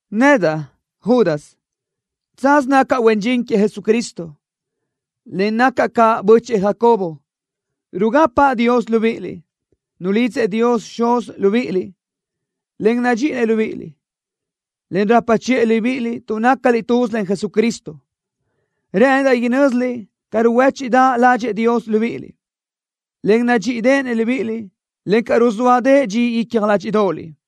Nedaʼ, Judas, tsaz nacaʼ huen dxin queëʼ Jesucristo, en nacaʼ caʼ bö́chëʼë Jacobo. Rugapaʼ Dios libíʼiliʼ, nulidzëʼ Dios Xuz libíʼiliʼ, en nadxíʼinëʼ libíʼiliʼ, en rapa chiʼë libíʼiliʼ tuʼ nácaliʼ tuz len Jesucristo. Rë́ʼëndaʼ inö́ziliʼ ca ruhuéchiʼdaʼ ládxëʼë Dios libíʼiliʼ, en nadxíʼideʼenëʼ libíʼiliʼ, encaʼ ruzóadëʼë dxi icja ládxiʼdoʼoliʼ.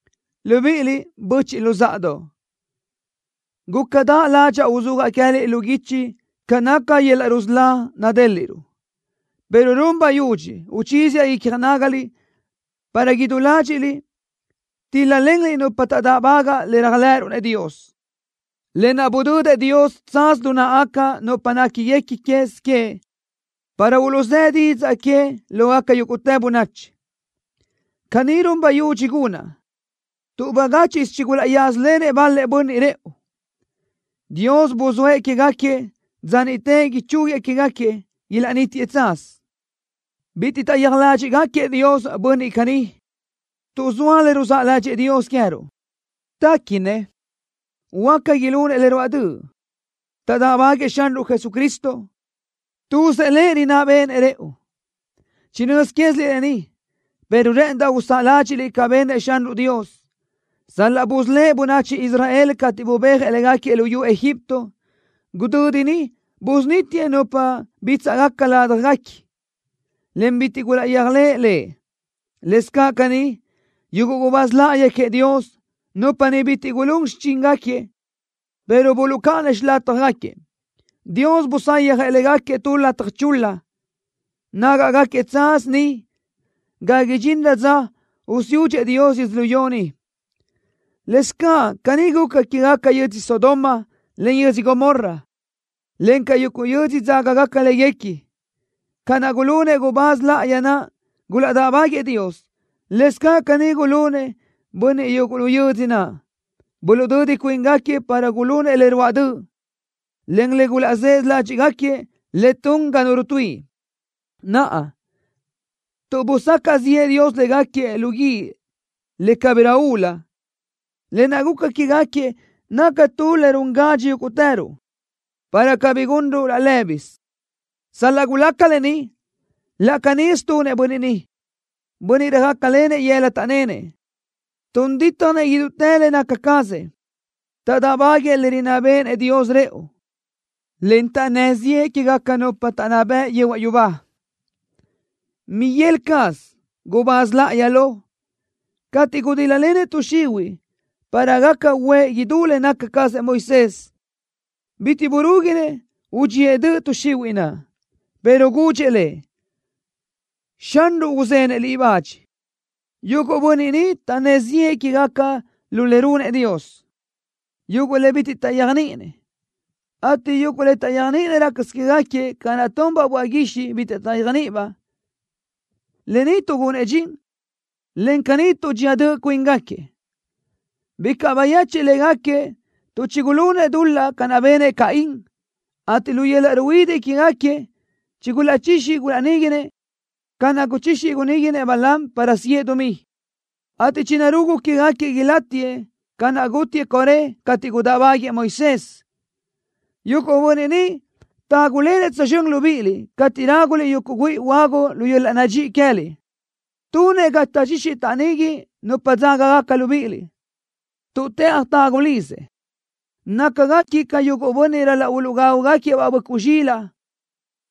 Libíʼiliʼ, böchiʼ luzáʼadoʼ, gúcadaʼ ládxaʼa uzúajaʼ queë́liʼ lu guichi ca naca yöl-laʼ rusölá nadéliʼruʼ, pero run bayudxi uchíziaʼ icja nágaliʼ para idú ládxiʼliʼ tíl-lalenliʼ nupa taʼdáʼbagaʼ le réajlëʼëruʼ-nëʼ Dios, lë naʼ budödëʼ Dios tsaz lu náʼagaca nupa néquiguequi quez queëʼ para uluʼzë́ didzaʼ que lógaca yúguʼtë bönachi. Caní run bayudxi gunaʼ tuʼ bagáchiʼsö chigulaʼyázalenëʼ bal-lëʼ bönniʼ rëʼu, Dios buzóëʼ quégaquiëʼ dza niʼte ichúguiëʼ quégaquiëʼ ilaʼnítiëʼ tsaz. Bitiʼ taʼyéaj ládxiʼgaquiëʼ Dios bönniʼ caní. Tuʼ zoa le ruzáʼ ládxëʼë Dios queë́ruʼ, téquinëʼ huáca ilunëʼ le ruáʼ döʼ. Taʼdáʼbaguëʼë Xanruʼ Jesucristo. Tuzëʼ Lëʼ rinná béʼenëʼ rëʼu. Chinö́z quéziliʼ lë ni, pero rë́ʼëndaʼ usáʼa ládxiʼliʼ ca benëʼ Xanruʼ Dios. Sal-laʼ busölë́ʼ bönachi Israel cateʼ bubéajëʼ léguequi luyú Egipto, gudödi niʼ busunítiëʼ nupa bítsaʼgaca ládjaguequi, en bitiʼ gulaʼyéajlëʼ Lëʼ. Lëscaʼ caní, yuguʼ gubáz láʼayi queëʼ Dios, nupa niʼ bitiʼ gulún xichíngaquiëʼ, pero buluʼcáʼanëʼ xilátjagaquiëʼ, Dios busayjëʼ légaquiëʼ tu lataj chul-la. Nágaʼgaquiëʼ tsaz niʼ ga idxinrö dza usiúdxëʼ Dios yödzölió ni. Lëscaʼ caní guca quégaca yödzö Sodoma, en yödzö Gomorra, encaʼ yuguʼ yödzö dzágagaca léguequi. Ca naʼ gulunëʼ gubáz láʼayi naʼ, gulaʼdáʼbaguëʼë Dios, lëscaʼ caní gulunëʼ bönniʼ yuguʼ lu yödzö naʼ. Buluʼdödi cuíngaquiëʼ para gulunëʼ le ruáʼ döʼ, en le gulaʼzësö ládxiʼgaquiëʼ le tun ga nu rutuíʼi. Naʼa, tuʼ busacaʼ ziʼë Dios légaquiëʼ lu guíʼ le cabirö ulu, lë naʼ guca quégaquiëʼ naca tu le run gadxi yúguʼtëruʼ, para cabí gunruʼ laʼ lë́bisö. Sal-laʼ gulaca lë ni, laʼ canísö tunëʼ bönniʼ ni, bönniʼ röjácalenëʼ yëla taʼnénëʼ. Tun dítjanëʼ idútë le naca cazëʼ. Taʼdáʼbaguëʼë le rinná béʼenëʼ Dios rëʼu, en taʼnnë́ ziʼë quégaca nupa taʼnná bëʼ yehuaʼ yubá. Miguel caz, gubáz láʼayi lo, cateʼ gudíl-lalenëʼ tuʼ xihuiʼ para gaca uʼë idú le naca cazëʼ Moisés, bitiʼ burúguinëʼ udxíëʼ döʼ tuʼ xihuiʼ naʼ, pero gudxëʼ le: “Xanruʼ uzenëʼ liʼ bach.” Yuguʼ bönniʼ ni taʼnnë́ ziʼë quégaca le runëʼ Dios, yuguʼ le bitiʼ taʼyéajniʼinëʼ, ateʼ yuguʼ le taʼyéajniʼinëʼ rácasö quégaquiëʼ ca naʼ tunbaʼ böaʼ guixiʼ bitiʼ taʼyéajniʼibaʼ, lë ni tuʼgunëʼ dxin, en caní tuʼdxía döʼ cuíngaquiëʼ. Bicaʼ bayechiʼ légaquiëʼ tuʼ chigulunëʼ dul-laʼ ca naʼ benëʼ Caín, ateʼ lu yöl-laʼ ruhuidiʼ quégaquiëʼ chigulaʼchixi gulaʼníguinëʼ ca naʼ guchixi guníguinëʼ Balaam para siʼë dumí, ateʼ chinarugu quégaquiëʼ ilátiëʼ ca naʼ gútiëʼ Coré cateʼ gudáʼbaguiëʼ Moisés. Yuguʼ bönniʼ ni tágulenëʼ tsözxö́n libíʼiliʼ cateʼ ráguliʼ yuguʼ güíʼi huagu lu yöl-laʼ nadxíʼi queë́liʼ. Tunëʼ ga taʼchixi taʼnigui nupa dzágagaca libíʼiliʼ, tuʼ tëʼaj tagu lizëʼ. Nácagaquiëʼ ca yuguʼ bönniʼ ral-laʼ uluʼgágugaquiëʼ-baʼ böʼcuʼ zxilaʼ,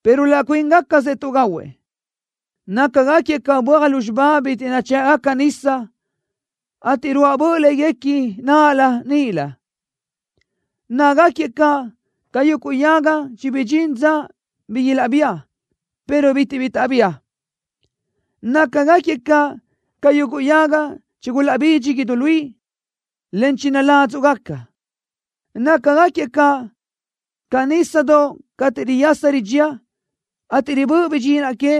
pero laʼ cuíngacasëʼ tuʼgahuëʼ. Nácagaquiëʼ ca böaj lúzxiba bitiʼ nachë́ʼgaca nisa, ateʼ ruáʼ böʼ léguequi náʼalö níʼilö. Nácagaquiëʼ caʼ ca yuguʼ yaga chibidxín dza bi ilaʼbía, pero bitiʼ bi taʼbía. Nácagaquiëʼ caʼ ca yuguʼ yaga chigulaʼbidxi idú luí, en chinaládzuʼgaca. Nácagaquiëʼ caʼ ca nísadoʼ cateʼ riyasa ridxía, ateʼ ribö́ʼ bidxinaʼ que,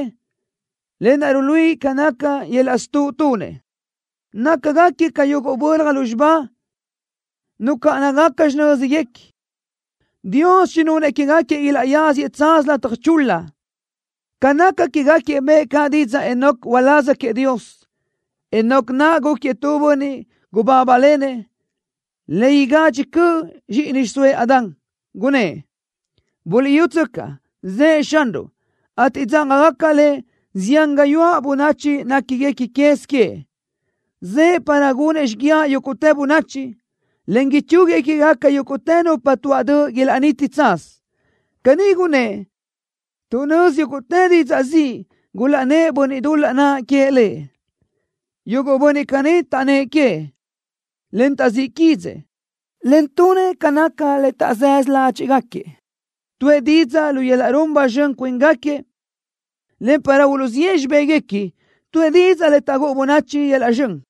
lë naʼ ruluíʼi ca naca yöl-laʼ stuʼ tunëʼ. Nácagaquiëʼ ca yuguʼ bölaj lúzxiba nucáʼanagacabaʼ xinö́zgacabaʼ. Dios chinunëʼ quégaquiëʼ ilaʼyáziëʼ tsaz lataj chul-la. Ca naca quégaquiëʼ bëʼë caʼ didzaʼ Enoc uláz queëʼ Dios. Enoc naʼ gúquiëʼ tu bönniʼ gubábalenëʼ le igadxi cöʼ zxíʼini xiʼsóëʼ Adán. Gunnë́ʼ: “Buliʼyútsöcaʼ, zëʼë Xanruʼ, ateʼ dzágagaca Lëʼ zián gayuáʼ bönachi néquiguequi quez queëʼ. Zëʼë para gunëʼ xíguiaʼ yúguʼtë bönachi, en ichúguiëʼ quégaca yúguʼtë nupa tuaʼ döʼ ilaʼniti tsaz.” Caní gunëʼ tuʼ nözi yúguʼtë didzaʼ ziʼ gulaʼnnë́ʼ bönniʼ dul-laʼ naʼ queëʼ Lëʼ. Yuguʼ bönniʼ caní taʼnnë́ʼ queëʼ, en taʼzíʼ quídzëʼë, en tunëʼ ca naca le taʼzësö ládxiʼgaquiëʼ. Tuʼë didzaʼ lu yöl-laʼ run ba zxön cuíngaquiëʼ, en para uluʼziʼë xibéguequi, tuʼë didzaʼ le taʼgúʼu bönachi yöl-laʼ zxön.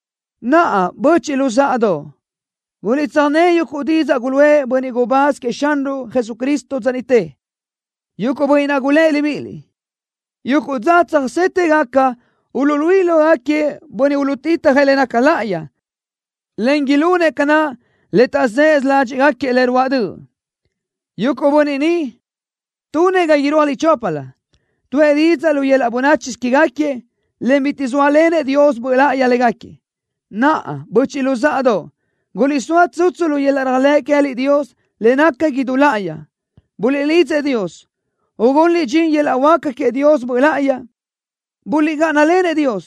Naʼa, böchiʼ luzáʼadoʼ, guliʼtsöjné yuguʼ didzaʼ guluʼë bönniʼ gubáz queëʼ Xanruʼ Jesucristo dza niʼte. Yuguʼ bönniʼ naʼ gulë́ʼ libíʼiliʼ: “Yuguʼ dza tsöjsétëgaca uluʼluíʼi lógaquiëʼ bönniʼ uluʼtitjëʼ le naca láʼayi, en ilunëʼ ca naca le taʼzësö ládxiʼgaquiëʼ le ruáʼ döʼ.” Yuguʼ bönniʼ ni tunëʼ ga irúajliʼ choplö. Tuʼë didzaʼ lu yöl-laʼ bönáchisö quégaquiëʼ, en bitiʼ zóalenëʼ Dios Böʼ Láʼayi légaquiëʼ. Naʼa, böchiʼ luzáʼadoʼ, guliʼsóa tsutsu lu yöl-laʼ réajlëʼ queë́liʼ Dios le naca idú láʼayi. Buliʼlidzëʼ Dios, ugunliʼ dxin yöl-laʼ huáca queëʼ Dios Böʼ Láʼayi. Buliʼgáʼanalenëʼ Dios,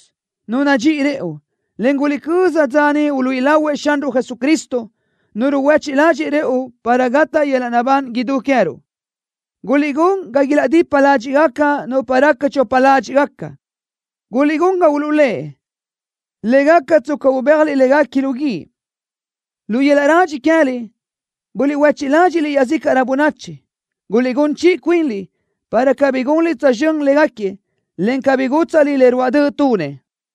Nu nadxíʼi rëʼu, en guliʼcöza dza niʼ uluíʼi lahuëʼ Xanruʼ Jesucristo, Nu ruhuéchiʼ ládxëʼë rëʼu para gataʼ yöl-laʼ naʼbán idú queë́ruʼ. Guliʼgún ga ilaʼdipa ládxiʼgaca nupa raca chopa ládxiʼgaca. Guliʼgún ga uluʼlë́ʼ, le gaca tsca ubéajliʼ légaquiëʼ lu guíʼ. Lu yöl-laʼ radxi queë́liʼ buliʼhuéchiʼ ládxiʼliʼ iaʼzícaʼrö bönachi. Guliʼgún chiʼi cuinliʼ, para cabí gunliʼ tsözxö́n légaquiëʼ, en cabí gútsaʼliʼ le ruáʼ döʼ tunëʼ.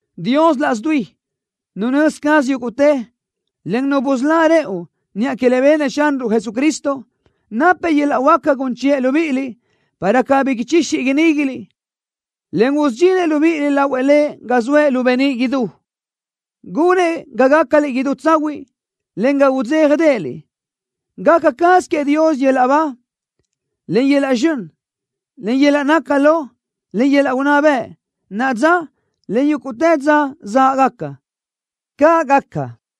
Dios laʼs dui, Nu nözi caz yúguʼtë, en Nu busölá rëʼu niʼa que le benëʼ Xanruʼ Jesucristo, napëʼ yöl-laʼ huáca gun chiʼë libíʼiliʼ, para cabí ichixi iníguiliʼ, en usudxinëʼ libíʼiliʼ lahuëʼ Lëʼ ga zoëʼ lu beníʼ idú. Gunëʼ ga gácaliʼ idú tsahuiʼ, en ga udzéjadeʼeliʼ. ¡Gaca caz queëʼ Dios yöl-laʼ ba, en yöl-laʼ zxön, en yöl-laʼ naca lo, en yöl-laʼ unná bëʼ, naʼa dza, en yúguʼtë dza záʼgaca! ¡Caʼ gaca!